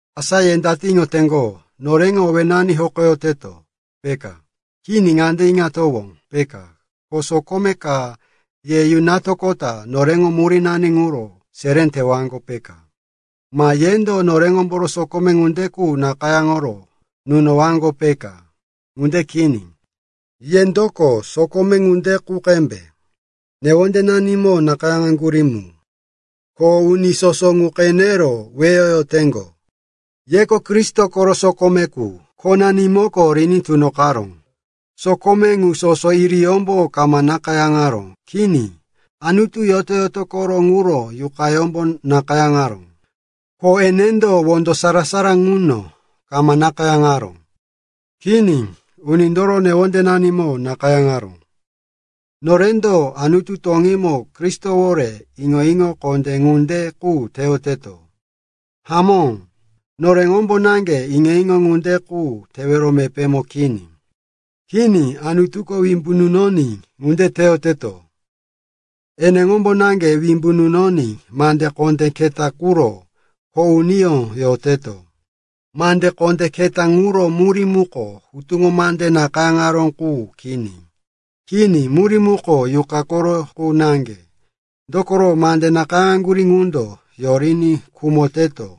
Asa ye date iŋoteŋgo, noreŋo owénani hokoyoteto, peka? Kini. Ŋande iŋatowó, peka, ko sokome ka ye yunatoqota noreŋo murínani ŋuro seré tewaŋgo, peka, ma yendo noreŋomboro sokome ŋunde qu nakayáŋoro nunowaŋgo, peka? Ŋunde kini. Yendoko sokome ŋunde qu qembe, newondenanimo nakayáŋaró mu, ko uni soso ŋu qenero weyoyoteŋgo. Yeko Kristo koro sokome qu, khonanimoko riní tunoqaró. Sokome ŋu sono iriyómbo kama nakayáŋaró. Kini, Anutu yoto-yotoyó moré ŋuro Yuqayómbo nakayáŋaró. Ko enendo wondo sarara ŋuno kama nakayáŋaró. Kini, unindoro newondenanimo nakayáŋaró. Norendo Anutu toŋímo Kristowore iŋo-iŋo kondé ŋunde qu teyoteto. Hamó, noreŋombo naŋge iŋo-iŋo ŋunde qu tewero mepémo kini. Kini, Anutuko wimbu nunoní ŋunde teyoteto. Eneŋombo naŋge wimbu nunoní mande kondé keta ŋuro kho uniyó yoteto. Mande kondé keta ŋuro murí muko hutuŋo mande nakayáŋaró qu kini. Kini, murí muko Yuqa koro qu naŋge. Dokoro mande nakayáŋaŋgurí ŋundo yoriní khumoteto,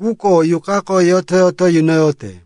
quko Yuqako yoto-yoto yunoyote.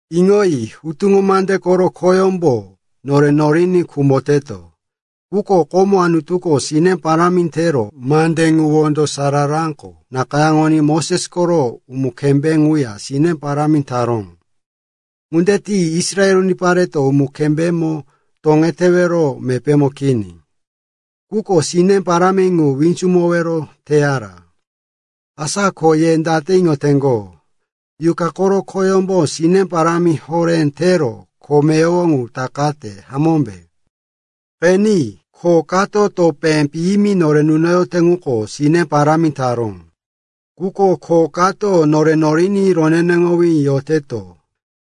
Iŋoyi. Hutuŋo mande koro khoyómbo nore noriní khumoteto. Quko komo Anutuko sine parámi tero mande ŋu wondo sararako nakayáŋoní Moses koro umu-kembé ŋuya sine parámi taró. Ŋunde tiní Israel unipareto umu-kembémo toŋetewero mepémo kini. Quko sine parámi ŋu winzumowero teyara. Asa ko ye date iŋoteŋgo, Yuqa koro khoyómbo sine parámi horé tero kho meyowo ŋu takate, hamómbe? Qeni, kho kato topé piyimi nore nunoyote ŋuko sine parámi taró. Quko kho kato nore noriní roneneŋowí yoteto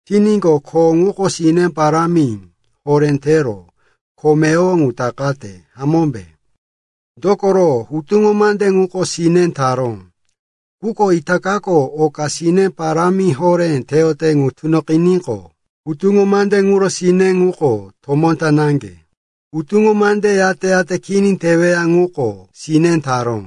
tiníqo, kho ŋuko sine parámi horé tero kho meyowo ŋu takate, hamómbe? Dokoro, hutuŋo mande ŋuko sine taró. Quko itakako oka sine parámi horé teyote ŋu tunoqiníqo, hutuŋo mande ŋuro sine ŋuko tomó ta naŋge. Hutuŋo mande yate-yate kini teweya ŋuko sine taró.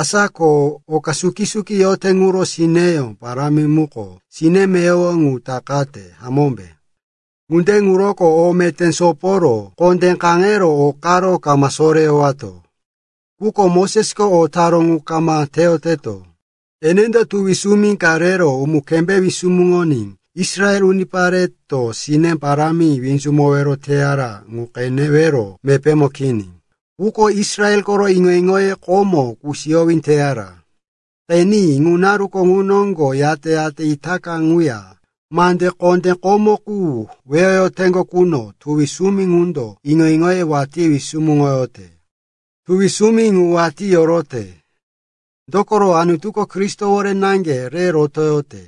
Asa ko oka suki-suki yote ŋuro sineyó parámi muko sine meyowo ŋu takate, hamómbe? Ŋunde ŋuroko o meté soporo kondé kaŋero o karo kama soreyowato. Quko Mosesko o taró ŋu kama teyoteto. Enendo tuwi sumi ka rero umu-kembé wisumuŋoní Israel unipareto sine parámi winzumowero teyara ŋu qenewero mepémo kini. Quko Israel koro iŋo-iŋoye komo kusiyowí teyara. Qeni, ŋu naruko ŋu noŋgo yate-yate itaka ŋuya mande kondé komo qu weyoyoteŋgo quno tuwi sumi ŋundo iŋo-iŋoye watí wisumuŋoyote. Tuwi sumi ŋu watí yorote, dokoro Anutuko Kristowore naŋge re rotoyote.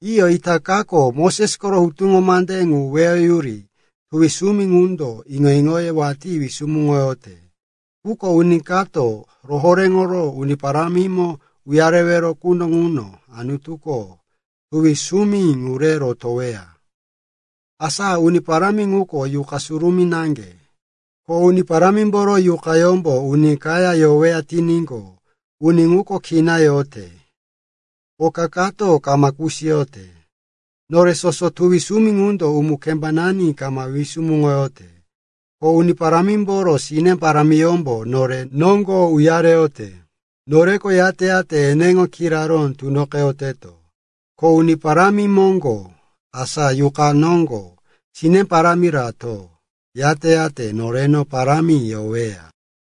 Iyo, itakako Moses koro hutuŋo mande ŋu weyoyuri tuwi sumi ŋundo iŋo-iŋoye watí wisumuŋoyote. Quko uni kato rohoréŋoro Uni Parámimo uyareweya quno ŋuno Anutuko tuwi sumi ŋu re rotoweya. Asa Uni Parámi ŋuko Yuqa Surumí naŋge. Ko Uni Parámimboro Yuqayómbo uni kaya yoweya tiníqo, uni ŋuko kina yote, oka kato kama kusiyote. Nore soso tuwi sumi ŋundo umu-kembanani kama wisumuŋoyote, ko Uni Parámimboro sine parámiyómbo nore noŋgo uyareyote. Noreko yate-yate eneŋo kiraró tunoqeyoteto, ko Uni Parámi moŋgo, asa Yuqa noŋgo sine parámi rato, yate-yate noreno parámi yoweya.